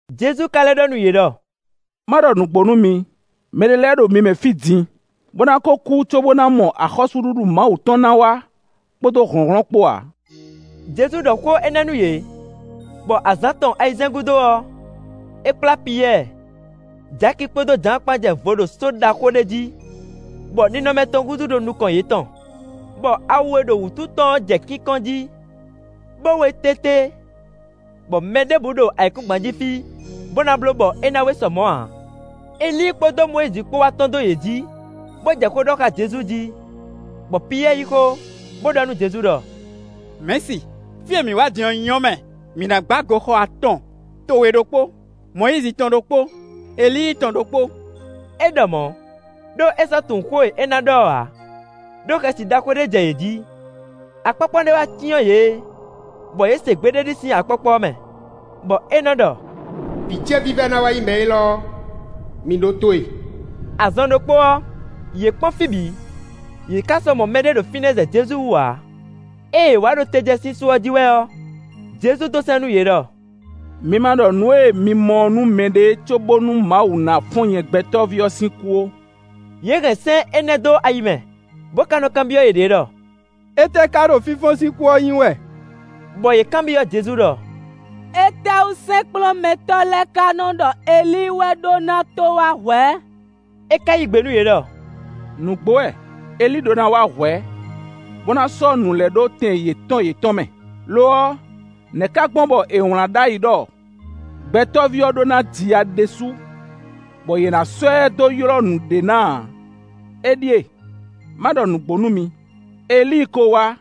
Jezu ka lɛ́ ɖɔ nú yě ɖɔ: “Má ɖɔ nǔgbó nú mi, mɛɖé lɛ́ɛ ɖo mi mɛ fí din, bó ná kó kú cóbó ná mɔ axɔ́súɖuɖu Mawu tɔn ná wá kpódó hlɔ̌nhlɔ́n kpó ǎ.” Jezu ɖɔ xó énɛ́ nú yě, bɔ azǎn tɔn ayizɛ́n gúdo ɔ́, é kplá Piyɛ́ɛ, Jaki kpódó Jǎan kpán jɛ vo ɖo só ɖaxó ɖé jí, bɔ ninɔmɛ tɔn húzú ɖo nukɔn yětɔn. Bɔ awu e ɖo wǔtu tɔn ɔ́ jɛ kínkɔ́n jí, bó wé tété, bɔ mɛ ɖěbǔ ɖo ayǐkúngban jí fí bó ná bló bɔ é ná wé sɔ mɔ̌ ǎ. Elíi kpódó Mɔyízi kpó wá tɔ́n dó yě jǐ, bó jɛ xó ɖɔ xá Jezu jí. Bɔ Piyɛ́ɛ yí xó, bó ɖɔ nú Jezu ɖɔ: “Mɛ̌si, fí e mǐ wá din ɔ́ nyɔ́ mɛ! Mǐ ná gbá goxɔ atɔn, towe ɖokpó, Mɔyízi tɔn ɖokpó, Elíi tɔn ɖokpó.” É ɖɔ mɔ̌, ɖó é sɔ́ tunwun xó e é ná ɖɔ ɔ́ ǎ, ɖó xɛsi ɖaxó ɖé jɛ yě jí. Akpɔ́kpɔ́ ɖé wá cyɔ́n yě, bɔ yě se gbe ɖé sín akpɔ́kpɔ́ ɔ́ mɛ, bɔ é nɔ́ ɖɔ: “Vǐ ce vívɛ́ná wɛ nyí mɛ élɔ́; mi ɖótó e.” Azɔn ɖokpó ɔ́, yě kpɔ́n fí bǐ, yě ká sɔ́ mɔ mɛɖé ɖo fínɛ́ zɛ Jezu wú ǎ. Ée yě wá ɖo te jɛ sín só ɔ́ jí wɛ ɔ́, Jezu dó sɛ́n nú yě ɖɔ: “Mi ma ɖɔ nǔ e mi mɔ ɔ́ nú mɛɖé cóbónú Mawu ná fɔ́n nyɛ Gbɛtɔ́ví ɔ́ sín kú ó.” Yě hɛn sɛ́n énɛ́ dó ayi mɛ, bó ka nɔ́ kanbyɔ́ yěɖée ɖɔ: “Étɛ́ ká ɖo ‘fínfɔ́n sín kú’ ɔ́ nyí wɛ?” Bɔ yě kanbyɔ́ Jezu ɖɔ: “Étɛ́wú sɛ́nkplɔ́nmɛtɔ́ lɛ́ɛ ka nɔ́ ɖɔ Elíi wɛ ɖó ná tó wá hwɛ̌?” É ka yí gbe nú yě ɖɔ: “Nǔgbó wɛ, Elíi ɖó ná wá hwɛ̌, bó ná sɔ́ nǔ lɛ́ɛ ɖó tɛn yětɔn yětɔn mɛ. Lo ɔ́, nɛ̌ ka gbɔn bɔ è wlǎn ɖ'ayǐ ɖɔ Gbɛtɔ́ví ɔ́ ɖó ná ji ya ɖésú, bɔ yě ná sɔ́ ɛ dó ylɔ́ nǔɖé ná ǎ? Éɖíe, má ɖɔ nǔgbó nú mi: Elíi ko wá,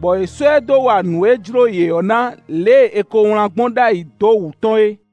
bɔ yě sɔ́ ɛ dó wa nǔ e jló yě ɔ́ ná lě e è ko wlán gbɔn ɖ'ayǐ dó wǔ tɔn é.”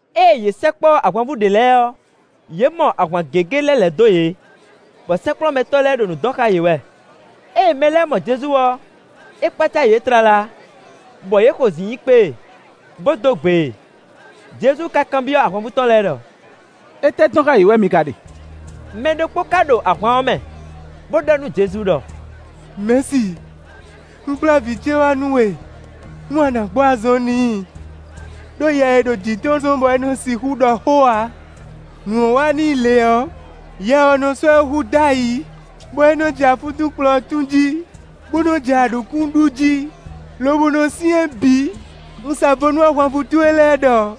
Ée yě sɛkpɔ́ ahwanvú ɖě lɛ́ɛ ɔ́, yě mɔ ahwan gěgé lɛ́ lɛ̌ dó yě, bɔ sɛ́nkplɔ́nmɛtɔ́ lɛ́ɛ ɖo nǔ dɔn xá yě wɛ. Ée mɛ lɛ́ɛ mɔ Jezu ɔ́, é kpácá yě tlala, bɔ yě xozǐn yi kpé e, bó dó gbe e. Jezu ka kanbyɔ́ ahwanvú tɔn lɛ́ɛ ɖɔ: “Étɛ́ dɔn xá yě wɛ mi ka ɖe?” Mɛ ɖokpó ká ɖo ahwan ɔ́ mɛ, bó ɖɔ nú Jezu ɖɔ: “Mɛ̌si, un kplá vǐ ce wá nú we, nú a nǎ gbɔ azɔn n'i; ɖó yɛ e ɖo jǐ tɔn ɔ́ zɔ́n bɔ é nɔ́ sixú ɖɔ xó ǎ. Nǔ ɔ́ wá n'i lě ɔ́, yɛ ɔ́ nɔ́ sɔ́ ɛ hu dó ayǐ, bɔ é nɔ́ jɛ afúntúnkplɔ̌ tún jí, bó nɔ́ jɛ aɖǔkún ɖu jí, lobo nɔ syɛ́n bǐ. Un sa vo nú ahwanvú towe lɛ́ɛ ɖɔ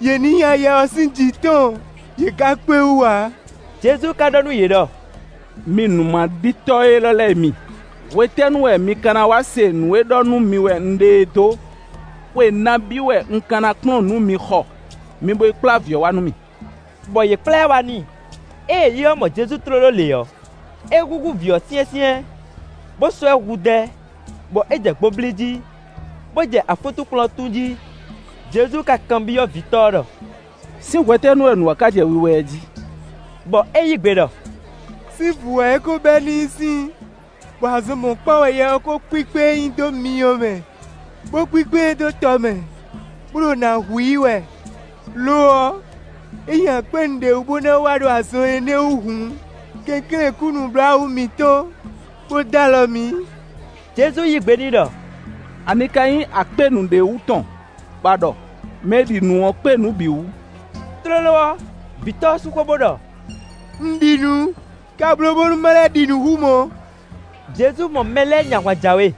yě ní nya yɛ ɔ́ sín jǐ tɔn, yě ká kpé wú ǎ.” Jezu ka ɖɔ nú yě ɖɔ: “Mi nǔmaɖitɔ́ élɔ́ lɛ́ɛ mi, hwetɛ́nu wɛ mi ka ná wá se nǔ e ɖɔ nú mi wɛ un ɖe é dó? Xwe nabí wɛ un ka na kplɔ́n nǔ mi xɔ? Mi bo yi kplá vǐ ɔ́ wá nú mì.” Bɔ yě kplá ɛ wá n'i. Ée yɛ ɔ́ mɔ Jezu tlóló lě ɔ́, é húnhún vǐ ɔ́ syɛ́nsyɛ́n, bó sɔ́ ɛ hudɛ́, bɔ é jɛ gbo blí jí, bó jɛ afúntúnkplɔ̌ tún jí. Jezu ka kanbyɔ́ vǐtɔ́ ɔ́ ɖɔ: “Sín hwetɛ́nu wɛ nǔ ɔ́ ká jɛ wiwa ɛ jí?” Bɔ é yí gbe ɖɔ: “Sín vǔ wɛ é ko bɛ́ n'i sín; bɔ azɔn mɔ̌kpán wɛ yɛ ɔ́ kó kpíkpé e dó myɔ mɛ, bó kpíkpé e dó tɔ mɛ, bó ɖo nǎ hu i wɛ. Lo ɔ́, ényí a kpé nǔɖé wú bó ná wa ɖo azɔn énɛ́ ɔ́ wú hǔn, kɛnklɛ́n kú nǔbláwǔ mǐtɔn bó dó alɔ mǐ.” Jezu yí gbe n'i ɖɔ: “Ani ka nyí a kpé nǔɖé wú tɔn bɔ a ɖɔ? Mɛ e ɖi nǔ ɔ́ kpé nǔ bǐ wú.” Tlóló ɔ́, vǐtɔ́ ɔ́ sú xó, bó ɖɔ: “Un ɖi nǔ, ka bló bónú má lɛ́ ɖi nǔ hú mɔ̌.” Jezu mɔ mɛ lɛ́ɛ nyi ahwan jǎwe,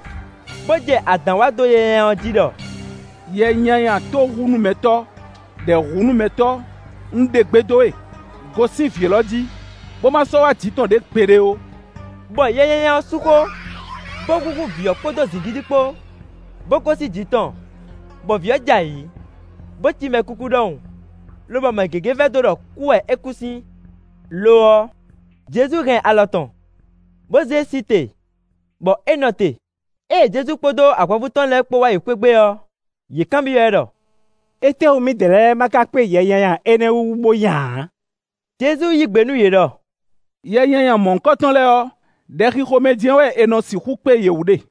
bó jɛ adǎn wa dó yɛ nyanya ɔ́ jí ɖɔ: “Yɛ nyanya tóhunúmɛtɔ́, ɖɛ̌hunúmɛtɔ́, un ɖe gbe dó we, gosín vǐ élɔ́ jí, bó má sɔ́ wá jǐ tɔn ɖě gbeɖé ó.” Bɔ yɛ nyanya ɔ́ sú xó, bó húnhún vǐ ɔ́ kpódó zǐngídi kpó, bó gosín jǐ tɔn; bɔ vǐ ɔ́ jɛ ayǐ, bó cí mɛkúkú ɖɔhun, lobɔ mɛ gěgé vɛdó ɖɔ kú wɛ é kú sín. Lo ɔ́, Jezu hɛn alɔ tɔn, bó zé e sí te, bɔ é nɔ te. Ée Jezu kpódó ahwanvú tɔn lɛ́ɛ kpó wá yi xwé gbe ɔ́, yě kanbyɔ́ ɛ ɖɔ: “Étɛ́wú mǐdɛɛ lɛ́ɛ má ká kpé yɛ nyanya énɛ́ wú bó nya ǎ?” Jezu yí gbe nú yě ɖɔ: “Yɛ nyanya mɔ̌hunkɔtɔn lɛ́ɛ ɔ́, ɖɛxixo mɛ jɛ́n wɛ è nɔ sixú kpé yě wú ɖe.”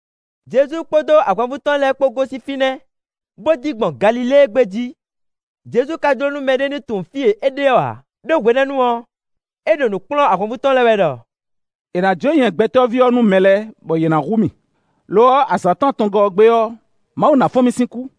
Jezu kpódó ahwanvú tɔn lɛ́ɛ kpó gosín fínɛ́, bó dín gbɔn Galilée gbé jí. Jezu ka jló nú mɛɖé ní tunwun fí e é ɖe ɔ́ ǎ, ɖó hwenɛ́nu ɔ́, é ɖo nǔ kplɔ́n ahwanvú tɔn lɛ́ɛ wɛ ɖɔ: “È nǎ jó nyɛ Gbɛtɔ́ví ɔ́ nú mɛ lɛ́ɛ, bɔ yě ná hu mì, lo ɔ́, azǎn tɔn atɔngɔ́ ɔ́ gbe ɔ́, Mawu ná fɔ́n mì sín kú.”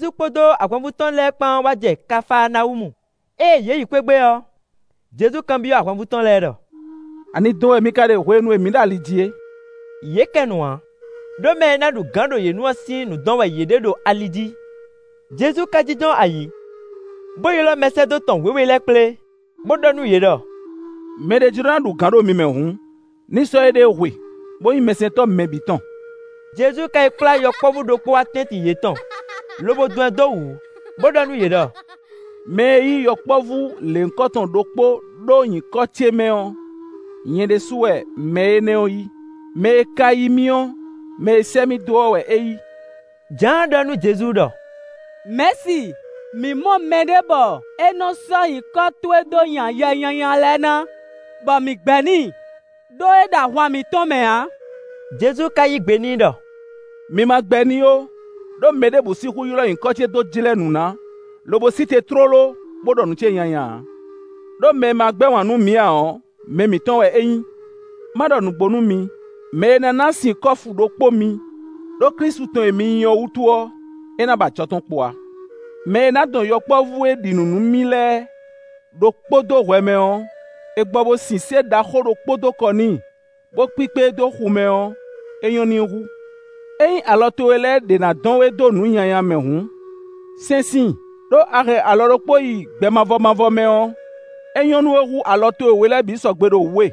Jezu kpódó ahwanvú tɔn lɛ́ɛ kpán wá jɛ Kafaanawúmu. Ée yě yi xwé gbe ɔ́, Jezu kanbyɔ́ ahwanvú tɔn lɛ́ɛ ɖɔ: “Ani dɔn wɛ mi ka ɖe hwenu e mǐ ɖo ali jí é?” Yě kɛ nu ǎ, ɖó mɛ e ná ɖu gǎn ɖo yě nu ɔ́ sín nǔ dɔn wɛ yě ɖe ɖo ali jí. Jezu ka jínjɔ́n ayǐ, bó ylɔ́ mɛsɛ́dó tɔn wěwe lɛ́ɛ kplé, bó ɖɔ nú yě ɖɔ: “Mɛ ɖé jló ná ɖu gǎn ɖo mi mɛ hǔn, ní sɔ́ éɖée hwe, bó nyí mɛsɛntɔ́ mɛ bǐ tɔn.” Jezu ka yi kplá yɔkpɔ́vú ɖokpó wá tɛ́ntin yětɔn, lobo dɔn ɛ dó wǔ, bó ɖɔ nú yě ɖɔ: “Mɛ e yí yɔkpɔ́vú lěhunkɔtɔn ɖokpó ɖó nyǐkɔ ce mɛ ɔ́, nyɛ ɖésúnɔ wɛ mɛ énɛ́ ɔ́ yí; mɛ e ka yí mì ɔ́, mɛ e sɛ́ mì dó ɔ́ wɛ é yí.” Jǎan ɖɔ nú Jezu ɖɔ: “Mɛ̌si, mǐ mɔ mɛɖé bɔ é nɔ́ sɔ́ nyǐkɔ towe dó nya yɛ nyanya lɛ́ɛ ná, bɔ mǐ gbɛ́ n'i, ɖó é ɖo ahwan mǐtɔn mɛ ǎ.” Jezu ka yí gbe n'i ɖɔ: “Mi ma gbɛ́ n'i ó, ɖó mɛ ɖěbǔ sixú ylɔ́ nyǐkɔ ce dó jlɛ́ nǔ ná, lobo sí te tlóló, bó ɖɔ nǔ ce nyanya ǎ. Đó mɛ e ma gbɛ́ wǎn nú mǐ ǎ ɔ́, mɛ mǐtɔn wɛ é nyí. Má ɖɔ nǔgbó nú mi: mɛ e ná ná sin kɔ́fu ɖokpó mi, ɖó Klísu tɔn e mi nyí ɔ́ wútu ɔ́, é ná ba ajɔ tɔn kpo ǎ. “Mɛ e ná dɔn yɔkpɔ́vú e ɖi nǔ nú mì lɛ́ɛ ɖokpó dó hwɛ mɛ ɔ́, è gbɔ bo sin sé ɖaxó ɖokpó dó kɔ n'i, bó kpíkpé e dó xu mɛ ɔ́, é nyɔ́ n'i hú. Ényí alɔ towe lɛ́ɛ ɖě ná dɔn we dó nǔ nyanya mɛ hǔn, sɛ́n síin, ɖó a hɛn alɔ ɖokpó yi gbɛ mavɔ mavɔ mɛ ɔ́, é nyɔ́ nú we hú alɔ towe we lɛ́ɛ bǐ sɔgbe ɖo wǔ we,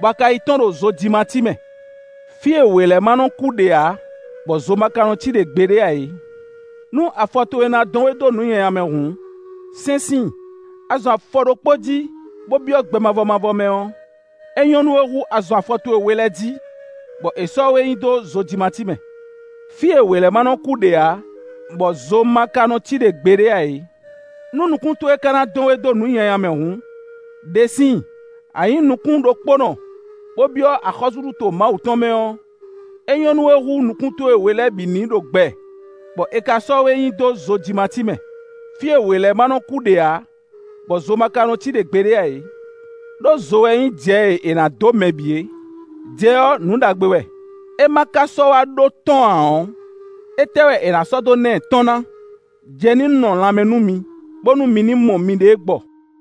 bɔ a ka yi tɔ́n ɖo zojimací mɛ, [ fí e ‘wě lɛ́ɛ má nɔ́ kú ɖe ǎ, bɔ zo ma ka nɔ cí ɖe gbeɖé ǎ é.’] Nú afɔ towe ná dɔn we dó nǔ nyanya mɛ hǔn, sɛ́n síin; a zɔn afɔ ɖokpó jí, bó byɔ́ gbɛ mavɔ mavɔ mɛ ɔ́, é nyɔ́ nú we hú a zɔn afɔ towe we lɛ́ɛ jí, bɔ è sɔ́ we nyi dó zojimací mɛ, [ fí e ‘wě lɛ́ɛ ma nɔ́ kú ɖe ǎ, bɔ zo ma ka nɔ cí ɖe gbeɖé ǎ é.’] Nú nukún towe ka ná dɔn we dó nǔ nyanya mɛ hǔn, ɖe síin; a nyǐ nukún ɖokpónɔ, bó byɔ́ axɔ́súɖuto Mawu tɔn mɛ ɔ́, é nyɔ́ nú we hú nukún towe we lɛ́ɛ bǐ ní ɖo gbɛ, bɔ è ka ná sɔ́ we nyi dó zojimací mɛ, fí e ‘wě lɛ́ɛ ma nɔ́ kú ɖe ǎ, bɔ zo ma ka nɔ cí ɖe gbeɖé ǎ é.’ Đó zo wɛ nyí jɛ e è nǎ dó mɛ bǐ é. “Jɛ ɔ́, nǔ ɖagbe wɛ; é ma ka sɔ́ wá ɖó tɔ́n ǎ ɔ́, étɛ́ wɛ è nǎ sɔ́ dó ná ɛ tɔ́n ná? Jɛ ní nɔ lanmɛ nú mi, bónú mi ní mɔ miɖée gbɔ.”